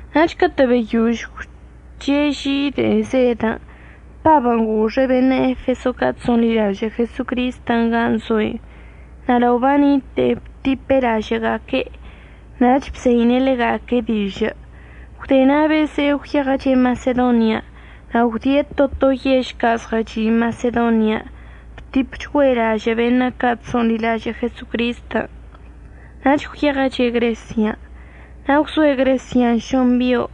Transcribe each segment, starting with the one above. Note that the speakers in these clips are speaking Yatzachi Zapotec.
Nach catə' beyož gwche' ži de'e zedən', Pabən' goxe' beṉə' Efeso ca' chso'onḻilažə' Jesocristən' gan' zo'enə' na' lao banite'enə' btipe' lažə'əga'aque', nach bzeine' ḻega'aque' dižə'. Gwde na' beze'e gwyeɉəche' Masedonian'. Na' gwdie' to to yež ca' zɉəchi' Masedonian' btipchgüe' lažə' beṉə' ca' chso'onḻilažə' Jesocristən', nach gwyeɉəche' Gresian'. Na' gwzoe' Gresian' šoṉ bio',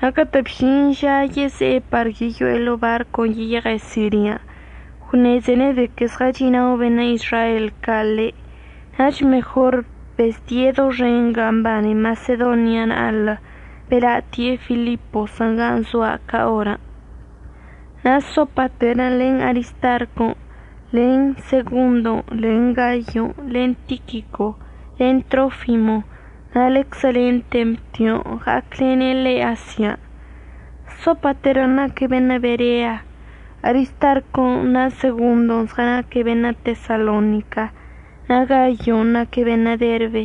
na' catə' bžin ža yeze'e par yeyo'e ḻo'o barcon' yeyeɉe' Sirian', gwṉezene' de que zɉəchi'inao beṉə' Izrael ca' ḻe', nach mejor bezdie' doxen gan' mbane Masedonia na'alə, bela'atie' Filiposən' gan' zoa' ca orən'. Na' Sopater len Aristarco len Segondo len Gayo len Tiquico len Trofimo na' ḻeczə len Temtion' ɉa'aclene' ḻe' Asian'. Sopaterən' naque' beṉə' Berea, Aristarcon' na' Segondo zɉənaque' beṉə' Tesalonica, na' Gayon' naque' beṉə' Derbe.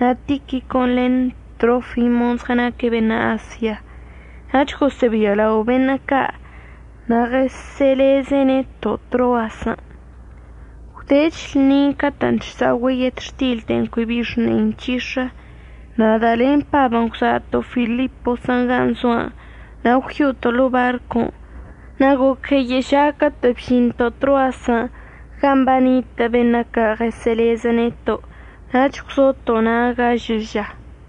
Na' Tiquicon' len Trofimon' zɉənaque' beṉə' Asia. Nach gosə'əbialao beṉə' ca' na' ɉəsə'əleze' neto' Troasən'. Gwdech lṉin' catə'ən chsa'ogüe' yetxtil de'en cui bi xne'i nc̱hix̱ə, nada' len Pabən' gwza'ato' Filiposən' gan' zo'anə' na' gwyo'oto' ḻo'o barcon' na' goc gueyə' ža catə' bžinto' Troasən' gan' banitə' beṉə' ca' ɉəsə'əlezə neto' nach gwzoto' na' gažə ža.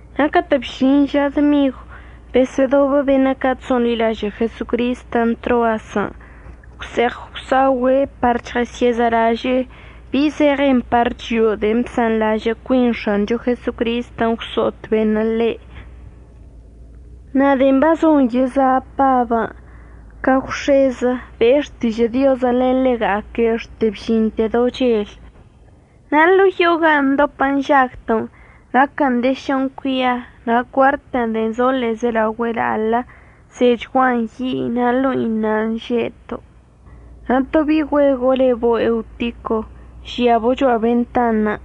Na' catə' bžin ža dmigw besə'ədobə beṉə' ca' chso'onḻilažə' Jesocristən' Troasən' gwse'eɉ gwsa'ogüe' par chɉəsyə'əzalaže'e bi zeɉen par chio'o de'en bsanḻažə' cuin X̱ancho Jesocristən' gwso'ot beṉə' ḻe'. Na' de'en bazon yeza' Pabən' ca gwx̱ezə be'e xtižə' Diozən' len ḻega'aque' xte bžinte do chel. Na' ḻo'o yo'o gan' ndopə nžagto' naquən de šoṉ cuia na' cuartən' de'en zo ḻe'ezelaogüe la'alə, zechguan yi' na' ḻo'i nan' že'eto'. Na' to bi'i güego' lebo' Eutico žiabo' cho'a bentanṉə'.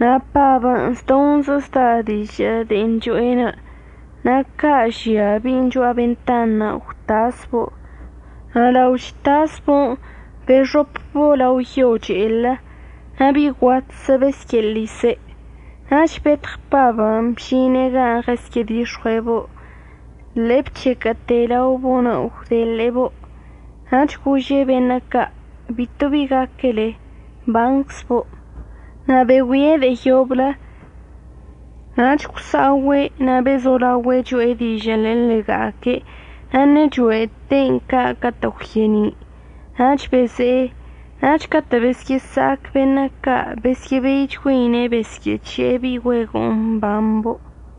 Na' Pabən' zdoṉzə zda dižə' de'en cho'enə' na' ca' žia bi'in cho'a bentanṉə' gwtasbo' na' lao chtasbo'on bexopəczlabo' lao yo che'elə. Na' bi'i guatzə besyə'əḻise'. Nach betɉ Pabən' bžine' gan' ɉəsyə'ədix̱ɉue'ebo'onə' ḻe'e bchequə'əte' laobo'onə' gwdeḻe'ebo'. Nach gože' beṉə' ca': ―Bito bi gaquele, mbanczbo'. Na' begüie' de'e yoblə nach gwsa'ogüe' na' bezolaogüe' cho'e dižə'ənə' len ḻega'aque', na' ṉe'e cho'ete'en ca' catə' gwye'eni'. Nach beze'e. Nach catə' besyə'əsa'ac beṉə' ca' besyə'əbeichgüeine' besyə'əc̱he'e bi'i güego'on mbambo'.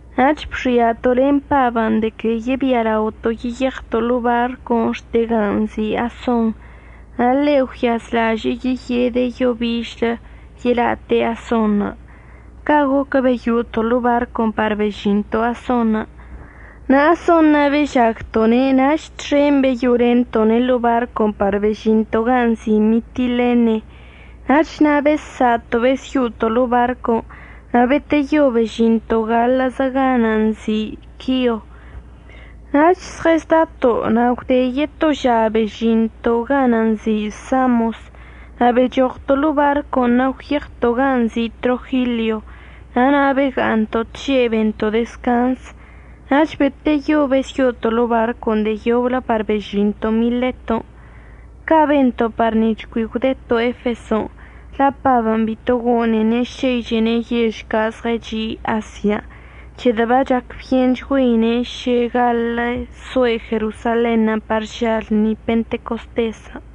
Nach bxi'ato' len Pabən' de que yebialaoto' yeyeɉto' ḻo'o barcon' xte gan' nzi' Ason, na' ḻe' gwyazlažə'əche' yeyede' yo bižlə yela'ate' Asonṉə'. Ca' goquən' beyo'oto' ḻo'o barcon' par bežinto' Asonṉə'. Na' Ason na' bežagto'one' nach txen beyo'olento'one' ḻo'o barcon' par bežinto' gan' nzi' Mitilene. Nach na' bessa'ato' besyo'oto' ḻo'o barcon' na' beteyo bežinto' gaḻə'əzə ganə' nzi' Quio. Nach zɉəzdato' na' gwde yeto ža bežinto' ganə' nzi' Samos. Na' bechoɉto' ḻo'o barcon' na' gwyeɉto' gan' nzi' Trogilio na' na' bega'aṉto' tže' bento' dezcanz. Nach beteyo besyo'oto' ḻo'o barcon' de'e yoblə par bežinto' Mileton'. Ca' bento' par nic̱h cui gwdeto' Efeson' la' Pabən' bito gone'ene' šeichene' yež ca' zɉəchi' Asian', c̱hedə' bachacbyenchgüeine' šə gaḻə' soe' Jerosalenṉə' par ža lṉi Pentecostesən'.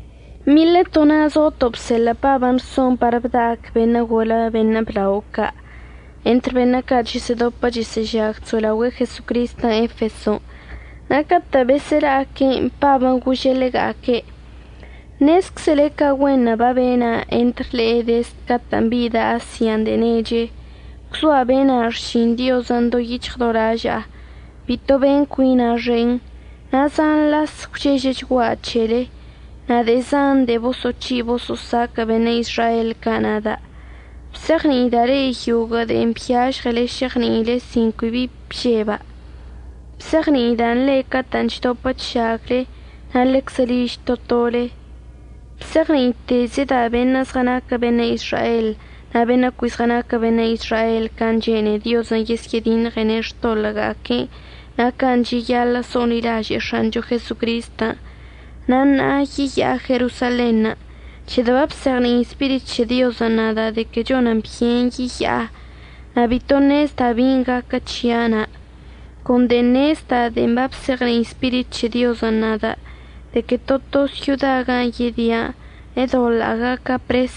Mileto na' zoto' bseḻə' Pabən' rson par bda'ac beṉə' golə beṉə' blao ca' entr beṉə' ca' chəsə'ədopə chəsə'əžag so'elaogüe'e Jesocristən' Efeson'. Na' catə' besə'əla'aque'enə' Pabən' gože' ḻega'aque': ―Nezczele ca güenṉə' babena' entr le'e dezd catə'ən bida' Asian' de'e neche. Gwzoa' bena' xšin Diozən' do yic̱hɉ do laža'a. Bito ben cuina' xen, na' zan las gwchežəchgua' c̱hele, na' de'e zan de'e boso'oc̱hi' boso'osaquə' beṉə' Izrael ca' nada'. Bzeɉni'ida' le'e yoguə' de'en byažɉele šeɉni'ile sin cui bžeba'. Bzeɉni'ida'an le'e catə'ən chdopə chžagle na' ḻeczə liž to tole. Bzeɉni'itezəda' beṉə' zɉənaquə beṉə' Izrael na' beṉə' cui zɉənaquə beṉə' Izrael can' chene'e Diozən' yesyə'ədiṉɉene' xtoḻə'əga'aque'enə' na' can' cheyaḻə' so'onḻilaže'e X̱ancho Jesocristən'. Na' ṉa'a yeya'a Jerosalenṉə' c̱hedə' babzeɉni'i Spirit c̱he Diozən' nada' de que chonən byen yeya'a, na' bito ṉezda' bin' gaquə c̱hia' na'. Con de'en ṉezda' de'en babzeɉni'i Spirit c̱he Diozən' nada' de que to to syoda gan' yedia' ədoḻa'a gaca' pres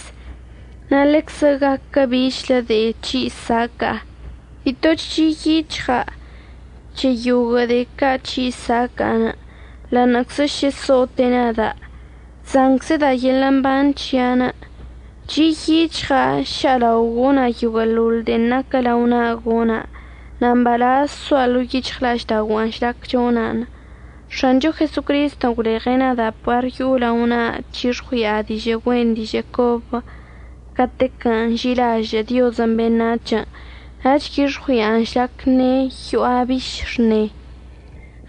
na' ḻeczə gaquə bichlə de'e c̱hi' saca'a. Bito chi' yic̱hɉa' c̱he yoguə' de'e ca' c̱hi' saca'a. Ḻa'aṉə'əczə šə so'ote' nada', chzanczəda' yeḻə' mban c̱hia'anə'. Chi' yic̱hɉa' ša'alao gona' yoguə'əḻoḻ de'en naquə lao na'a gona' na' mbalaz zoa' ḻo'o yic̱hɉla'aždaogua'anə' žlac chona'an. X̱ancho Jesocristən' gwleɉe' nada' par yo'o lao na'a chyix̱ɉui'a dižə' güen dižə' cobə catequən' nži'ilažə' Diozən' beṉac̱hən' na' c̱hix̱ɉui'an žlac ṉe'e yo'a biš xṉe.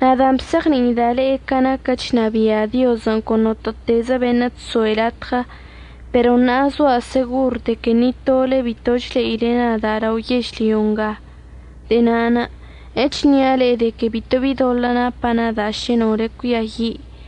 Nadan' bzeɉni'ida' le'e ca naquən' chnabia' Diozən' con notə'ətezə beṉə' chso'e latɉə pero ṉa'a zoa' segor de que ni tole bitoch le'ile nada' lao yežlyo nga. De'e na'anə' əchnia' le'e de que bito bi doḻə' napa' nada' šə nole cuiayi'.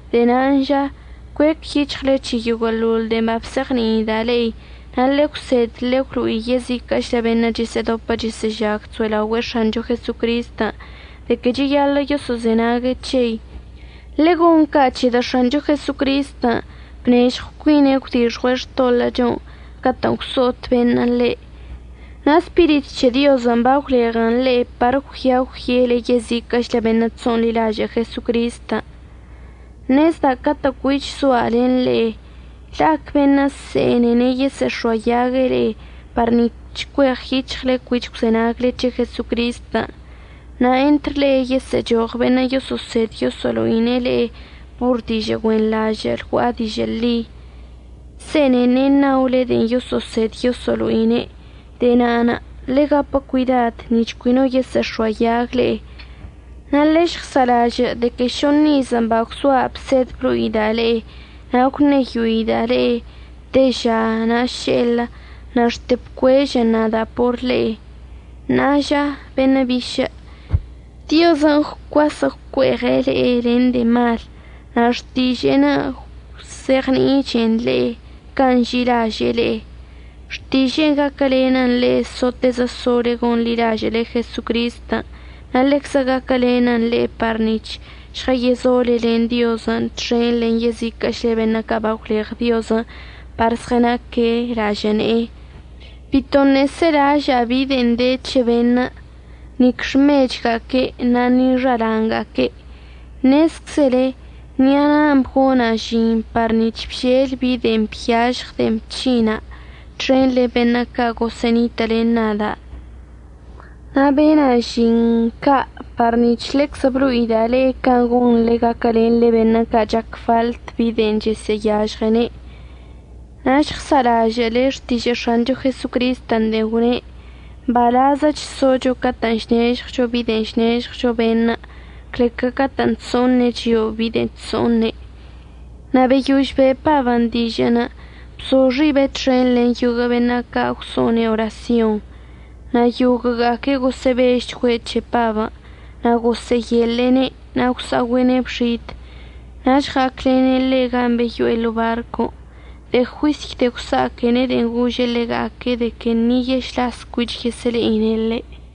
De'e nan' ža cuec yic̱hɉle c̱he yoguə'əḻol de'en babzeɉni'ida' le'e na' ḻegwsed ḻegwlo'i yežiquə'əchlə beṉə' chəsə'ədopə chəsə'əžag chso'elaogüe'e X̱ancho Jesocristən' de que cheyaḻə' yoso'ozenague' c̱hei. Ḻegon ca' c̱hedə' X̱ancho Jesocristən' bnežɉw cuine' gwdixɉue' xtoḻə'əchon' catə'ən gwso'ot beṉə' ḻe', na' Spirit c̱he Diozən' bagwleɉe' le'e par əggüia əgwyele yeziquə'əchlə beṉə' chso'onḻilažə' Jesocristən'. Ṉezda' catə' cuich zoa' len le'e la'ac beṉə' se'enene' yesə'əx̱oayague' le'e par nic̱h cueɉyic̱hɉle cuich gwzenagle c̱he Jesocristən'. Na' entr le'e yesə'əchoɉ beṉə' yoso'osed yoso'olo'ine' le'e por dižə' güenḻažə' lgua'a dižə' ḻi, se'enene' ṉaole de'en yoso'osed yoso'olo'ine'. De'e na'anə' ḻegapə cuidad nic̱h cui no yesə'əx̱oayag le'e. Na' ḻežɉza'alažə' de que šoṉ iz bagwzoa' bsed blo'ida' le'e na' gwṉeyoida' le'e teža na' še'elə na' xte bcuežən nada' por le'e. Ṉa'a ža beṉə' bišə', Diozən' gwcuasə' gwcue'eɉe' le'e len de'e malən' na' xtiže'enə' əgwzeɉni'ichən le'e can' nži'ilaže'e le'e. Xtiže'enə' gaquəlenən le'e sotezə sole gonḻilažə'əle Jesocristən' na' ḻeczə gaquəlenən le'e par nic̱h žɉəyezole len Diozən' txen len yeziquə'əchlə beṉə' ca' bagwleɉ Diozən' par zɉənaque' lažə' ne'enə'. Bitoṉə' selaža'a bi de'en de c̱he beṉə', nic xmechga'aque'enə' na' ni xala'anga'aque'. Ṉezczele ṉi'a na'a bgona' žin par nic̱h bžel bi de'en byažɉ de'en bc̱hinda' txen len beṉə' ca' gosə'ənitə' len nada'. Na' bena' žinṉə' ca' par nic̱h ḻeczə blo'ida' le'e can' gonḻe gaquəlenḻe beṉə' ca' chac faḻt bi de'en chəsə'əyažɉene'. Na' žɉsa'alažə'əle xtižə' X̱ancho Jesocristən' de'en gwne': “Mbalazəch zocho catə' chnežɉwcho bi de'en chnežɉwcho beṉə' cle ca catə'ən chso'oṉe' chio'o bi de'en chso'oṉe'.” Na' beyož be'e Pabən' dižə'ən bzo xiben' txen len yoguə' beṉə' ca' gwso'one' orasyonṉə'. Na' yoguə'əga'aque' gosə'əbežchgüe' c̱he Pabən' na' gosə'əyeḻe'ene' na' gwsa'ogüe'ene' bxid. Nach ɉa'aclene' ḻe' gan' beyo'e ḻo'o barcon'. De'e juisy de'e gwsa'aquene' de'en gože' ḻega'aque' de que ni yešlaszə cuich yesə'əle'ine' ḻe'.